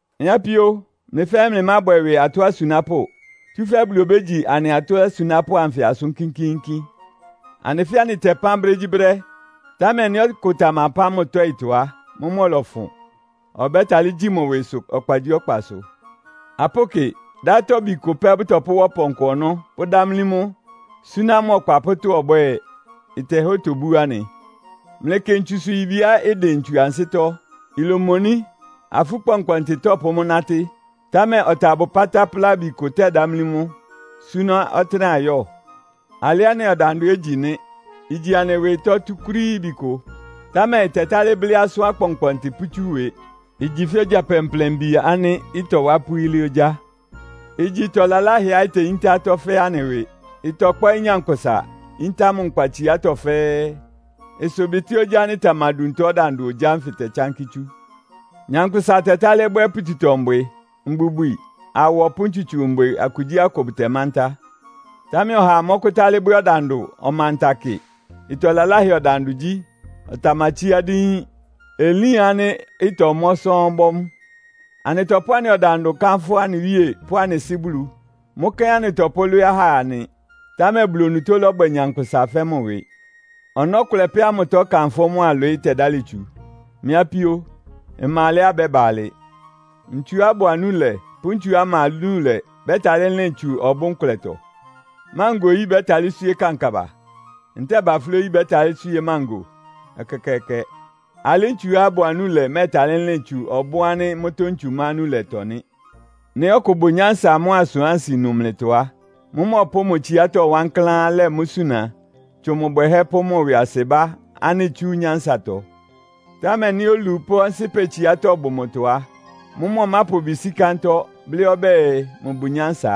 Mɩ́ apíó, mlɩ fɛ́ɛ́ mlɩmábwɛ ɩwɩ atɔ́ asunápʋ́. Tsúfɛ́ Bulu obégyi anɩ atɔ́ asunápʋ́ anfɩ asʋ́n kínkíínkín. Anɩ fɛ́ɛ́ anɩtɛpán brégyíbrɛ́, támɛ nɩ́ ɔkʋ tamapán mʋ tɔ́ɩtɔ á, mʋ́mʋ́ ɔlɔfʋn. Ɔbɛ́talɩ́ gyi mʋ ɩwɩsʋ ɔkpagyíɔkpasʋ. Apʋ́kɩ, dátɔbi kʋ pɛ́ bʋtɔpʋ́wá ɔpɔnkɔ ɔnɔ́, pʋ́dámlí mʋ, súná mʋ ɔkpa pʋ́ tɔ́á ɔbwɛ́ɛ. Ɩtɛhá otobú anɩ. Mlɩkɩ ntsusʋ-yibiá ɩdɩn ntsu ansɩ́tɔ́. Ilomoní, afú kpɔnkpɔntɩ tɔ́pʋ́ mʋ́ nátɩ́. Támɛ ɔtabʋ pátáplábi kʋ tɛ́dámlí mʋ́, súná ɔtɩ́nɛ́á ɩyɔ́ɔ. Alɩ́ anɩ ɔdandʋ ɛ́ igyi nɩ́. Igyi anɩ ɩwɩ ɩtɔ́ túkúrííbi kʋ. Támɛ ɩtɛtálɩ́ blɩ́ asʋ́n akpɔnkpɔntɩ pʋ́tsú ɩwɩ. Igyi fɛ́ ogya plɛnplɛnbi ánɩ́ ɩtɔwá ɩpʋ́ yílé ogyá. Igyi ɩtɔ laláhɛá iteyíntá atɔ́ fɛ́ɛ́ anɩ ɩwɩ. Ɩtɔkpɔ́ɩ́ nyankpʋsa, yíntá mʋ nkpatsiátɔ́ fɛ́ɛ́. Ɩsʋbɩtɩ́ ogyá ánɩ́ ɩtamaduntɔ ɔdandʋ ogyá ánfɩ tɛtsánkɩ́ tsú. Nyankpʋsa tɛtálɩ́ bwɛ́ pututɔ-mbwɩ, mbubwi, awɔ pʋ́ ntsutso mbwɩ akugyíakʋ bʋtɛmántá. Támɛ ɔhaa mɔ́kʋ́tálɩ́ bwɛ́ ɔdandʋ ɔmanta kɩ. Ɩtɔ laláhɛ ɔdandʋ gyí. Ɔtamatsíá díín. Elín ánɩ́ ɩtɔmɔ́ sɔ́ɔ́n bɔ́ mʋ́. Anɩtɔpʋ́ anɩ ɔdandʋ kánfʋ́ anɩ Wíe pʋ́ anɩ Sɩ́ Bulu. Mʋ́ kɛ́n anɩtɔpʋ́lwɩ́ɩ́ ahá nɩ. Támɛ Bulu onutó lɔ́bwɛ nyankpʋsa fɛ́ mʋ ɩwɩ. Ɔnɔ́ kʋlɛ pɛ́ ámʋtɔ ɩkanfʋ́ mʋ́a ɩlwɩɩ́ tɛdálɩ tsu. Mɩ́ apíó, ɩma alɛá ɩbɛ́ba alɩ. Ntsuá ɩbʋ anúlɛ pʋ́ ntsuá ɩma anúlɛ bɛ́talɩ́ lɩn tsu ɔbʋ́n kʋlɛtɔ? Mángo oyí bɛ́talɩ́ swíé kankaba? Ntɛ́ɛ baflɛ́ oyí bɛ́talɩ́ swíé mángo? Ɛkɛkɛɛkɛ! Alɩ́ ntsuá ɩbʋ anúlɛ mɛ́ɛtalɩ́ lɩn tsu ɔbʋ́n ánɩ́ mʋ́tɔ́ ntsu ma anúlɛtɔ nɩ́. Nɩ́ ɔkʋ bʋ nyánsa mʋ́a asʋ́n asɩnu mlɩtɔ á, mʋ́mʋ́ ɔpʋ́ʋ mʋ tsiátɔ́ wankláán lɛ mʋ́ suna tsʋn mʋ bwɛhɛ́ pʋ́ mʋ ɩwɩasɩbá ánɩ́ itsú mʋ nyánsatɔ. Támɛ nɩ́ olu pʋ́ ɔnsɩ́pɛ tsiátɔ́ bʋ mʋtɔ á, mʋ́mʋ́ ɔmápʋ ɩbɩ sí kántɔ́, blɩ́ ɔbɛ́ɛ mʋbʋ nyánsa.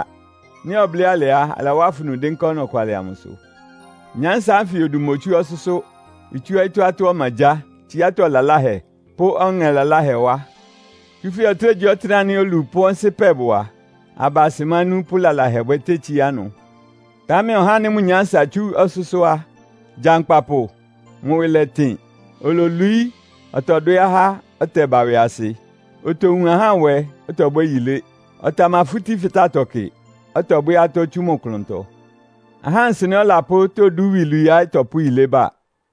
Nɩ́ ɔblɩ́ alɩ á, alawá afunu dɩ́nká ɔnɔkwalɩ amʋsʋ. Nyánsa ánfɩ odu motsú ɔsʋ́sʋ́. Itsú ɔyɩ́tɔ́ atɔ́ ɔmagyáa, tsiátɔ́ laláhɛ, pʋ́ ɔŋɛ laláhɛ wá. Tsúfɛ́ ɔtɩ́nɛgyíɔtɩ́nɛ́ ánɩ́ olu pʋ́ ɔnsɩ́pɛ bʋ a, aba asɩmánú pʋ́ lalahɛbwɛ tétsíá ɩnʋ. Támɛ ɔhá ánɩ́ mʋ nyánsa itsú ɔsʋ́sʋ́ á, gyankpapʋ, mʋ ɩwɩ lɛtɩn. Ololwií, ɔtɔdwɛ́ ahá, ɔtɛba ɩwɩasɩ. Otowun ahá nwɛ, ɔtɔbwɛ́ yilé. Ɔtamafútí fɩtátɔ kɩ, ɔtɔbwɛ́ atɔ́ tsú mʋ klʋntɔ. Ahá nsɩnɛ́ ɔlapʋ́ todú iwilwiiá ɩtɔpʋ́ yilébwɛ ba.